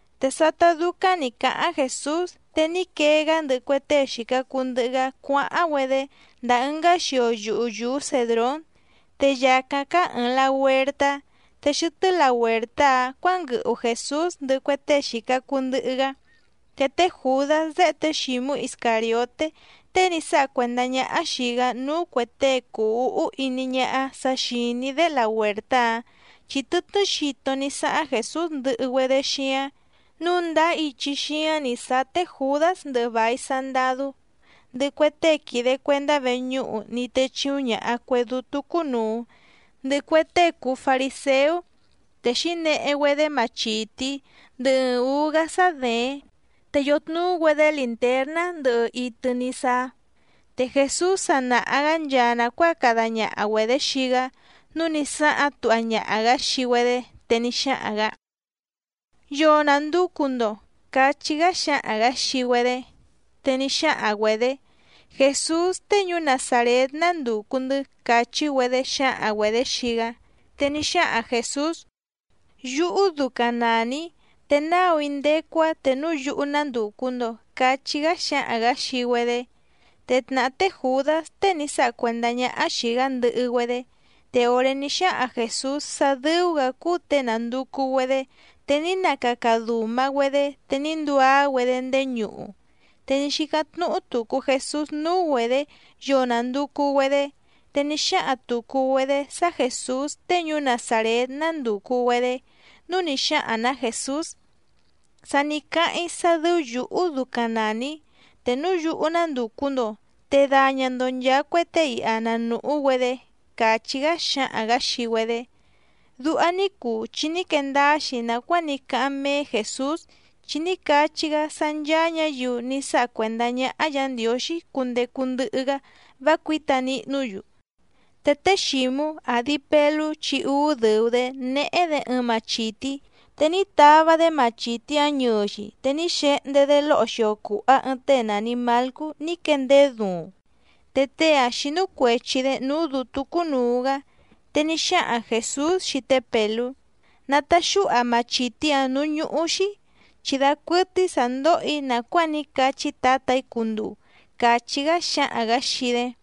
Te sátá dúcáⁿ nǐ cáháⁿ Jèsús, te ní quee‑gá ndɨhɨ cue tée xìca cuu ndɨhɨ‑gá cuáháⁿ‑güedé ndàa ɨngá xio yuhu yùú Cèdrón. Te yàcáⁿ cáá ɨ̀ɨⁿ lahuertá, te xɨtɨ́ lahuèrtá‑áⁿ cuǎnguɨhu Jèsús ndɨhɨ cue tée xìca cuu ndɨhɨ‑gá. Te té Jùdás déhe té Xǐmú Iscàrioté tée ní sáha cuèndá ñáhá xìi‑gá núú cuè tée cùu úhú iní ñáhá sa xìní‑dé lahuèrtá‑áⁿ chi tɨtnɨ́ xito ní sáháⁿ Jèsús ndɨhɨ‑güedé xíáⁿ. Núu ndáá ichi xíáⁿ nǐ sáá té Jùdás ndɨhɨ vài sandadú, ndɨhɨ cue tée quìde cuendá veñúhu ní techìuⁿ ñaha cue dútú cúnùu, ndɨhɨ cue tée cùu fariséú. Te xǐnehe‑güedé machìtí ndɨhɨ ɨɨⁿ ǔú‑gá sá děéⁿ, te yòtnuú‑güedé lìntérná ndɨhɨ itɨ ní sáá. Te Jèsús sa nàha‑gá nchaa nàcuáa cada ñaha‑güedě xii‑gá nǔu ní sáháⁿ tuha ñaha‑gǎ xii‑güedé, te ní xáhaⁿ‑gǎ: —¿Yoo nànducu‑ndo? —cachí‑gá xáhaⁿ‑gǎ xii‑güedé. Te ní xáhaⁿ‑güedě: —Jèsús tée ñuú Nazàrét nándùcu‑ndɨ́ —càchí‑güedé xǎhaⁿ‑güedě xii‑gá. Te ní xáhaⁿ Jèsús: —Yúhú ducaⁿ nàni‑í, te náu‑í ndécú‑á te núu yúhú nándùcu‑ndo —cachí‑gá xáhaⁿ‑gǎ xii‑güedé. Te tnàhá té Jùdás tée ní sáha cuèndá ñáhá xìi‑gá ndɨhɨ‑güedé. Te òré ní xáhaⁿ Jèsús sá dɨ́ú‑gǎ cúú těe nànducu‑güedé, te ní nacaca dùma‑güedé te ní nduá‑güedé ndéé ñuhu. Te ní xícáⁿ tnúhú tùcu Jesús núú‑güedě yoo nànducu‑güedé. Te ní xáhaⁿ tùcu‑güedé sá Jèsús tée ñuú Nazàrét nándùcu‑güedé, núu ní xáhaⁿ‑nǎ Jèsús: —Sa ní cáháⁿ‑í sá dɨ́ú yǔhú ducaⁿ nàni‑í, te núu yúhú nándùcu‑ndo, te daña‑ndo nchàa cue tée iha na nùhú‑güedé —càchí‑gá xáhaⁿ‑gǎ xii‑güedé. Duha ní cuu chi ní quee ndáá‑xi nàcuáa ní cáháⁿ méé Jèsús chi ní cachí‑gá sá ncháá ñǎyiu ní sáha cuèndá ñáhá Yǎ Ndiǒxí cundecu ndɨhɨ‑gá vá cuǐta nihnú‑yu. Te té Xǐmú, àdi Pelú chi úú dɨ̀u‑dé, néhé‑dě ɨɨⁿ machìtí, te ní tava‑dé machìtí‑áⁿ ñɨɨ‑xi te ní xehndé‑dé lóho xio cùha ɨɨⁿ tée nàni Malcú ní quéndeé duuⁿ. Te tée‑áⁿ xínú cuèchi‑dé núú dǔtú cúnùu‑gá. Te ní xáhaⁿ Jèsús xii té Pèlú: —Nataxúha machìtí‑áⁿ nǔú ñúhú‑xí, chi dacuɨtɨ́í sǎ ndóhò‑í nàcuáa ní cachí Tǎtà‑í cunduu —càchí‑gá xáhaⁿ‑gǎ xii‑dé.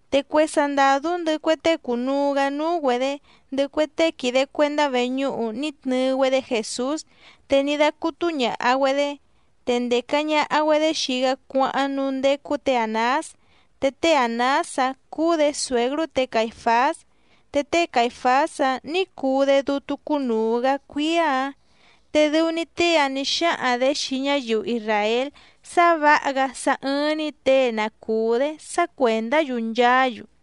Te cue sandàdú ndɨhɨ cue tée cùnuu‑gá núú‑güedě, ndɨhɨ cue tée quìde cuendá veñúhu ní tnɨɨ‑güedé Jèsús, te ní dácútú ñàha‑güedé. Te ndèca ñaha‑güedé xii‑gá cuáháⁿ núú ndécú tě Ànás, te té Ànás‑áⁿ cúú‑dě tǎtá ñadɨ̀hɨ́ té Caìfás. Te té Caìfás‑áⁿ nǐ cuu‑dé dútú cúnùu‑gá cuíá‑ǎⁿ. Te dɨu‑ni tée‑áⁿ nǐ xáhaⁿ‑dě xii ñáyiu isràél sá vǎha‑gá sá ɨ́ɨ́ⁿ‑ní těe na cùú‑dé sá cuèndá‑yu nchaá‑yu.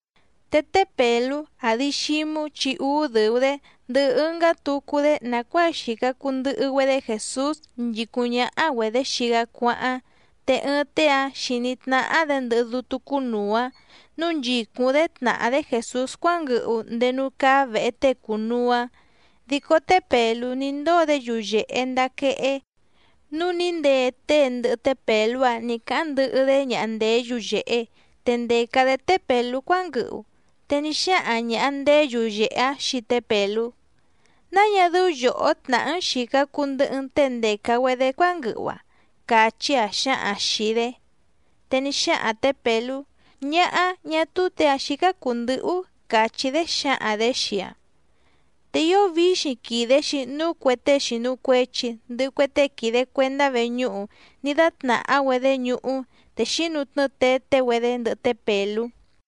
Te té Pèlú, àdi Xímú chi úú dɨ̀u‑dé, ndɨhɨ ɨngá tucu‑dé nàcuáa xìca cuu ndɨhɨ‑güedé Jèsús nchìcúⁿ ñáhá‑güedě xii‑gá cuáháⁿ. Te ɨɨⁿ tée‑áⁿ xìní tnáhá‑dě ndɨhɨ dútú cúnùu‑áⁿ nǔu nchìcúⁿ‑dé tnàhá‑dé Jèsús cuánguɨhu ndéé núú cáá vèhe tée cùnuu‑áⁿ. Dico té Pèlú ní ndóo‑dé yuyèhe ndaa quehé, núu ní ndee tée ndɨhɨ té Pèlú‑áⁿ nǐ cáháⁿ ndɨhɨ‑dé ñaha ndèé yuyèhe, te ndèca‑dé té Pèlú cuánguɨhu. Te ní xáhaⁿ ñàha ndéé yuyèhe‑áⁿ xii té Pèlú: —¿Náa ñá dɨ́ú yòhó tnàhá‑n xìca cuu ndɨhɨ‑n tée ndèca‑güedé cuánguɨhu‑a? —càchí‑aⁿ xǎhaⁿ‑aⁿ xìi‑dé. Te ní xáhaⁿ tě Pèlú: —Ñáhá, ñá túú těe‑ǎⁿ xícá cùu ndɨhɨ‑ú —càchí‑dé xǎhaⁿ‑dě xii‑aⁿ. Te ío víxiⁿ quìde‑xi núu cue tée xìnu cuechi, ndɨhɨ cue tée quìde cuendá veñúhu ní dátnàhá‑güedé ñuhú, te xínutnɨ́ɨ teté‑güedé ndɨhɨ té Pèlú.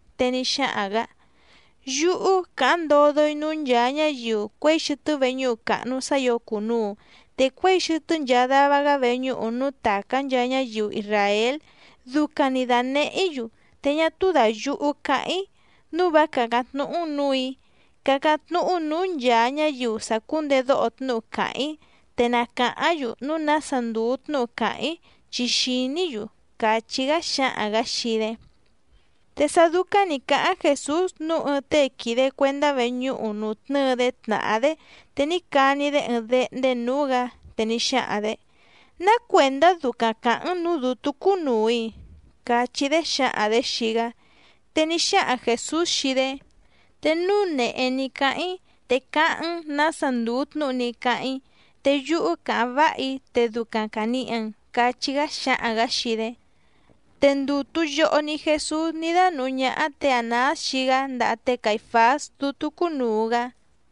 Te ní xáhaⁿ‑gǎ: —Yúhú càháⁿ ndodo‑í núú nchàa ñáyiu cuěi xɨtɨ́ veñúhu càhnu sá ǐo cùnuu, te cuěi xɨtɨ́ nchaa dava‑gá veñúhu núú tàcá nchaa ñáyiu isràél ducaⁿ‑ni dànehé‑í‑yu, te ñá túú dàyuhu cáháⁿ‑í. Núu vá càcáⁿ tnúhú‑n nǔù‑í. Cácáⁿ tnúhú nǔú nchàa ñáyiu sàcúndedóho tnúhu càháⁿ‑í, te na càháⁿ‑yu núu nása ndùu tnúhu càháⁿ‑í chi xìní‑yu —càchí‑gá xáhaⁿ‑gǎ xii‑dé. Te sá dúcáⁿ nǐ cáháⁿ Jèsús nǔu ɨɨⁿ tée quìde cuendá veñúhu nùtnɨ́ɨ‑dé tnàhá‑dé te ní cani‑dé ɨɨⁿ déhndé nǔú‑gǎ. Te ní xáhaⁿ‑dě: —¿Ná cuèndá ducaⁿ càháⁿ‑n nǔú dǔtú cúnùu‑i? —cachí‑dé xǎhaⁿ‑dě xii‑gá. Te ní xáhaⁿ Jèsús xii‑dé: —Te núu nèhé ní cáháⁿ‑í te cáháⁿ‑n nǎsa ndùu tnúhu ní cáháⁿ‑í, te yúhú càháⁿ váha‑í te ducaⁿ càniha‑n —cachí‑gá xáhaⁿ‑gǎ xii‑dé. Te ndùtu yoho‑ni Jesús ní dánùhú ñáhá tě Ànás xii‑gá ndaha té Caìfás dútú cúnùu‑gá.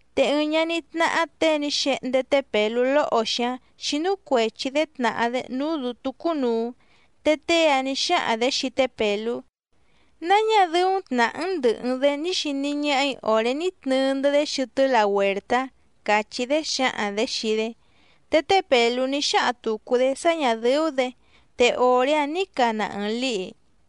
Te ɨɨⁿ ñaní tnáhá těe ní xehndé té Pèlú lóho‑xi‑áⁿ xínú cuèchi‑dé tnàhá‑dé núú dǔtú cúnùu. Te tée‑áⁿ nǐ xáhaⁿ‑dě xii té Pèlú: —¿Náa ñá dɨ́ú tnàhá‑n ndɨ̀hɨ‑n‑dé ní xiní ñáhà‑í òré ní tnɨɨ‑ndɨ́‑dé xɨtɨ́ lahuèrtá? —càchí‑dé xǎhaⁿ‑dě xii‑dé. Te té Pèlú ní xáhaⁿ tùcu‑dé sá ñà dɨ́ú‑dě, te òré‑áⁿ nǐ cana ɨɨⁿ lǐhi.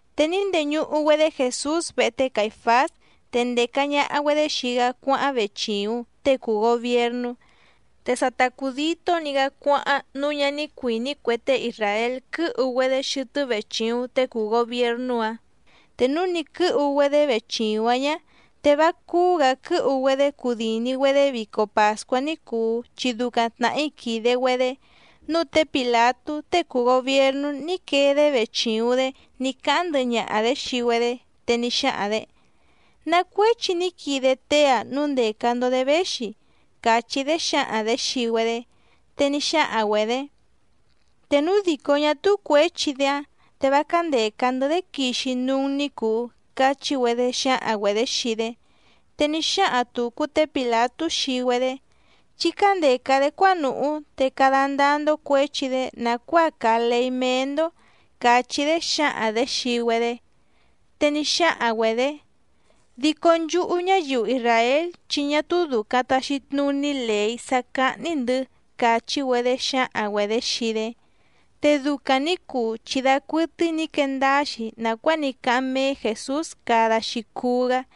Te ní ndeñuhu‑güedé Jèsús vehe té Caìfás, te ndèca ñaha‑güedé xii‑gá cuáháⁿ vechìuⁿ tée cùu gobiernú. Te sa ta cùditó‑ni‑gá cuáháⁿ nǔu ñá ní cuìní cue tée isràél quɨ́hu‑güedé xɨtɨ́ vechìuⁿ tée cùu gobiernú‑áⁿ. Te núu nì quɨ́hu‑güedé vechìuⁿ‑áⁿ ñá, te vá cúú‑gǎ quɨ́hu‑güedé cudìni‑güedé vico pàscuá ní cùu chi ducaⁿ tnàhí quìde‑güedé. Núu té Pìlatú tée cùu gobiernú ní quee‑dé vechìuⁿ‑dé ní cáháⁿ ndɨhɨ ñaha‑dě xii‑güedé, te ní xáhaⁿ‑dě: —¿Ná cuéchi ní quide tée‑a núu ndèca‑ndo‑dé véxi? —càchí‑dé xǎhaⁿ‑dě xii‑güedé. Te ní xáhaⁿ‑güedě: —Te núu dìcó ñá túú cuěchi‑dé‑áⁿ te vá cándèca‑ndɨ́‑dé quixi núú‑n ní cùu —cachí‑güedé xǎhaⁿ‑güedě xii‑dé. Te ní xáhaⁿ tùcu té Pìlatú xii‑güedé: —Chí cándèca‑dé cuánùhú, te cada ndáá‑ndó cuěchi‑dé nàcuáa càa leí méé‑ndó —càchí‑dé xǎhaⁿ‑dě xii‑güedé. Te ní xáhaⁿ‑güedě: —Dico nchúhú ñáyiu isràél chi ñá túú dùcaⁿ taxi tnuní lèí sá cáhní‑ndɨ̌ —càchí‑güedé xǎhaⁿ‑güedě xii‑dé. Te ducaⁿ nǐ cuu chi dacuɨtɨ́í nǐ quee ndáá‑xi nàcuáa ní cáháⁿ méé Jèsús cada‑xi cuú‑gá.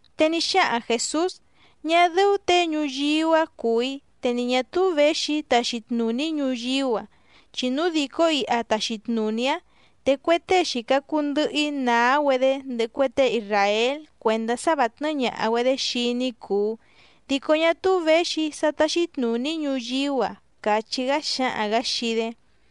Te ní xáhaⁿ Jèsús: —Ñá dɨ́ú těe ñuyíú‑a cùu‑í te ni ñà túú věxi‑í taxi tnùní‑í ñuyíú‑a, chi núu dìcó iha tàxi tnuní‑í áⁿ te cue tée xìca cuu ndɨhɨ‑í nàá‑güedé ndɨhɨ cue tée isràél cuèndá sá vǎ tnɨ́ɨ́ ñàha‑güedé xii‑í ní cùu, dico ñá túú věxi‑í sá táxí tnùní‑í ñuyíú‑a —càchí‑gá xáhaⁿ‑gǎ xii‑dé.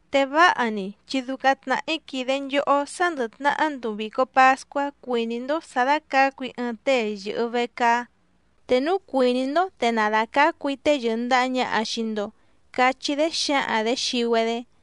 Te váha‑ni chi ducaⁿ tnàhí quìde nchohó sá ndɨ̀ tnahá nduu vìco pascuá cuìní‑ndó sǎ dácǎcu‑í ɨɨⁿ tée yɨ̀hɨ vecaá. Te núu cuìní‑ndó te na dàcácu‑í tée yɨ̀ndaha ñaha xii‑ndo —cachí‑dé xǎhaⁿ‑dě xii‑güedé.